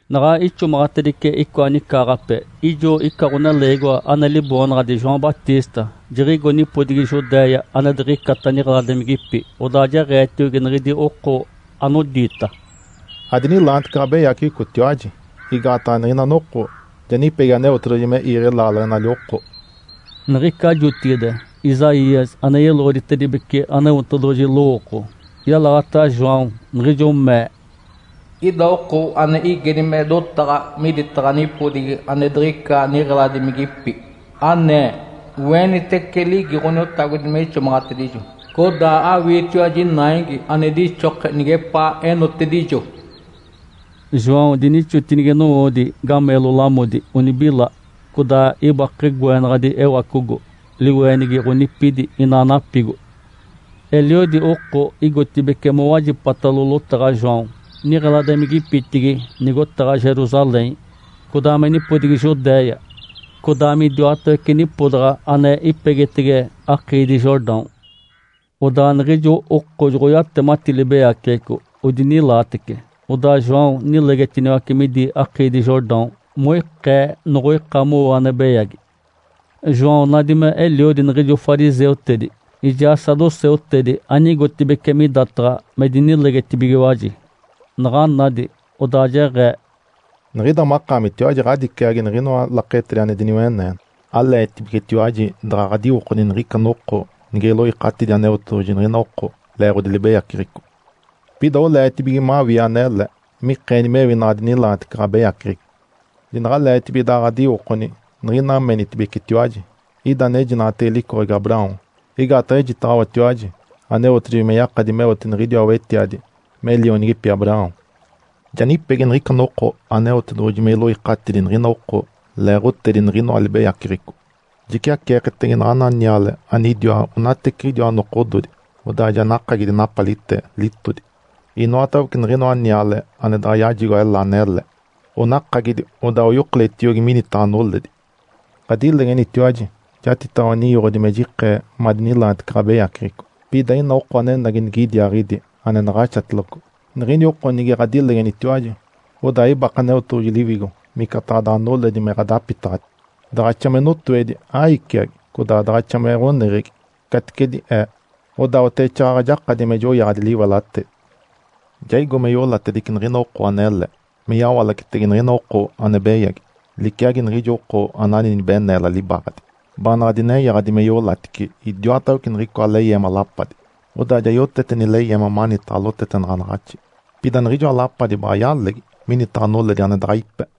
Naɡ̶a ixomaɡ̶atedice icoa nicaaɡ̶ape, ijo ica ɡ̶oneleegiwa ane liboonaɡ̶adi João Batista jiɡ̶igo nipodigi Judéia ane diɡ̶icata niɡ̶eladimigipi. Odaa jeɡ̶eetiogi niɡ̶idi oko anodiita, “Adinilaanitece ɡ̶abeyaceɡ̶ecotiwaji! Igaataɡ̶a niɡ̶ica noko ja nipegi Aneotedoɡ̶oji me iiɡ̶e laaleɡ̶enali oko.” Niɡ̶ica jotigide Isaías ane yeloɡ̶oditedibece Aneotedoɡ̶oji lowooko, yalaɡ̶ata João, niɡ̶ijo mee, “Ida oko ane igedi me dotaɡ̶a miditaɡ̶a nipodigi ane diɡ̶ica niɡ̶eladimigipi, anee, ‘Oenitece ligi Ǥoniotagodi me ixomaɡ̶atedijo! Codaa awiitiwaji naigi ane dixoke nigepaa enotedijo’.” João dinixotinigi nowoodi gameelo lamodi onibila, codaa ibake goenaɡ̶adi ewacogo, liweenigi ɡ̶onipidi inaa napigo. Eliodi oko igotibeci mowajipatalo lotaɡ̶a João, niɡ̶eladimigipitigi nigotaɡ̶a Jerusalém, codaa me nipodigi Judéia, codaa midiwatawece nipodaɡ̶a ane ipegitege akiidi Jordão. Odaa niɡ̶ijo oko joɡ̶oyatemati libeyaceɡ̶eco odinilaatece, odaa João nilegetiniwace midi akiidi Jordão (moikee noɡ̶oika mowo ane beyagi). João nadi me eliodi niɡ̶ijo fariseutedi ijaa saduceutedi anigotibeci midataɡ̶a me dinilegetibigiwaji. Naɡ̶a nadi, odaa jeɡ̶ee, “Niɡ̶ida makaamitiwaji ɡ̶adiciagi niɡ̶inoa laketedi ane diniweneene! Aleetibigetiwaji daɡ̶a ɡ̶adiwokoni niɡ̶ica noko nige iloikatidi Aneotedoɡ̶oji niɡ̶ina oko leeɡ̶odi libeyaceɡ̶eco? Pida oleetibige mawii anele mikeeni mewi naɡ̶adinilaanitece ɡ̶abeyaceɡ̶eco. Jinaɡ̶aleetibige daɡ̶a ɡ̶adiwokoni niɡ̶ina menitibecetiwaji, ‘Ida anejinaɡ̶atege licoɡ̶egi Abraão.’ Igaataɡ̶a ejitaɡ̶awatiwaji Aneotedoɡ̶oji me yakadi meote niɡ̶idiwa wetiadi me lionigipi Abraão. Ja nipegi niɡ̶ica noko Aneotedoɡ̶oji me iloikatidi niɡ̶ina oko leeɡ̶otedi niɡ̶inoa libeyaceɡ̶eco. Jiciaceeketege naɡ̶ana niale anidiwa onateciɡ̶idiwa nokododi, odaa ja nakagidi napalite litodi. Inoatawece niɡ̶inoa niale ane daɡ̶a yajigo ela anele, onakagidi, odaa oyokoletiogi minitaɡ̶a noledi. Ǥadilegenitiwaji jatitaɡ̶awa ninyoɡ̶odi me jikee madinilaanitece ɡ̶abeyaceɡ̶eco. Pida ina oko anenagi nigidiaaɡ̶idi ane naɡ̶axatiloco. Niɡ̶ini oko nige ɡ̶adilegenitiwaji, odaa ibake Aneotedoɡ̶oji Liwigo micataɡ̶a daɡ̶a noledi me ɡ̶adapitaɡ̶ati. Daɡ̶axa me notoedi, aiciagi, codaa daɡ̶axa me ɡ̶oneɡ̶egi, caticedi ee, odaa oteɡ̶exaaɡ̶aɡ̶a jakadi me joyaɡ̶adi liwelatedi. Ja igo me iolatedice niɡ̶ina oko anele me yawalacetege niɡ̶ina oko ane beyagi. Liciagi niɡ̶ijo oko anani nibeneela libaaɡ̶adi, baanaɡ̶a dinenyaɡ̶adi me iolatice idiwatawece niɡ̶icoa leyeema lapadi. Odaa ja yotete nileyeema manitaɡ̶a lotetenaɡ̶anaɡ̶axi, pida niɡ̶ijoa lapadi baɡ̶a yalegi minitaɡ̶a noledi ane daɡ̶a ipe.”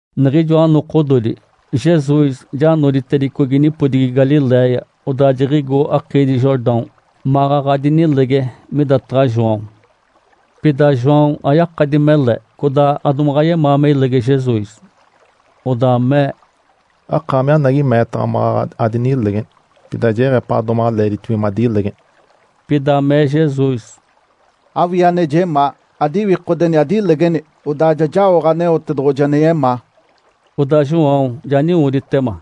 Niɡ̶ijoa nokododi, Jesus ja noditedicogi nipodigi Galiléia. Odaa jiɡ̶igo akiidi Jordão maɡ̶aɡ̶a dinilege midataɡ̶a João. Pida João ayakadi mele codaa adomaɡ̶a yemaa me ilege Jesus. Odaa mee, “Akaami anagi meetaɡ̶a maɡ̶aɡ̶a adinilegeni. Pida jeɡ̶epaɡ̶a domaɡ̶a leeditibige madilegeni.” Pida mee Jesus, “Awii ane jemaa, adiwikodeni adilegeni! Odaa ja jaoɡ̶a Aneotedoɡ̶oji ane yemaa.” Odaa João ja niwoditema.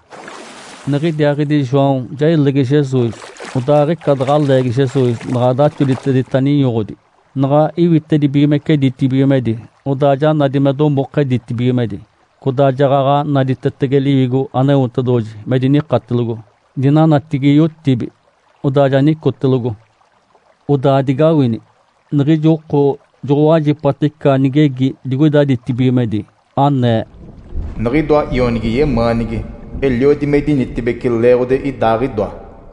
Niɡ̶idiaaɡ̶idi João ja ilege Jesus, odaa aɡ̶ica daɡ̶a leegi Jesus naɡ̶a daxoditedita ninyoɡ̶odi, naɡ̶a iwitedibigimece ditibigimedi, odaa ja nadi me domoke ditibigimedi, codaa jaɡ̶aɡ̶a naditetege Liwigo Aneotedoɡ̶oji me dinikatelogo dinanatigi yotibi, odaa ja nicotelogo. Odaa digawini! Niɡ̶ijo oko joɡ̶owajipata ica nigegi digoida ditibigimedi, anee, “Niɡ̶idoa Ionigi yemaanigi. Eliodi me idinitibeci leeɡ̶odi Idaaɡ̶idoa.”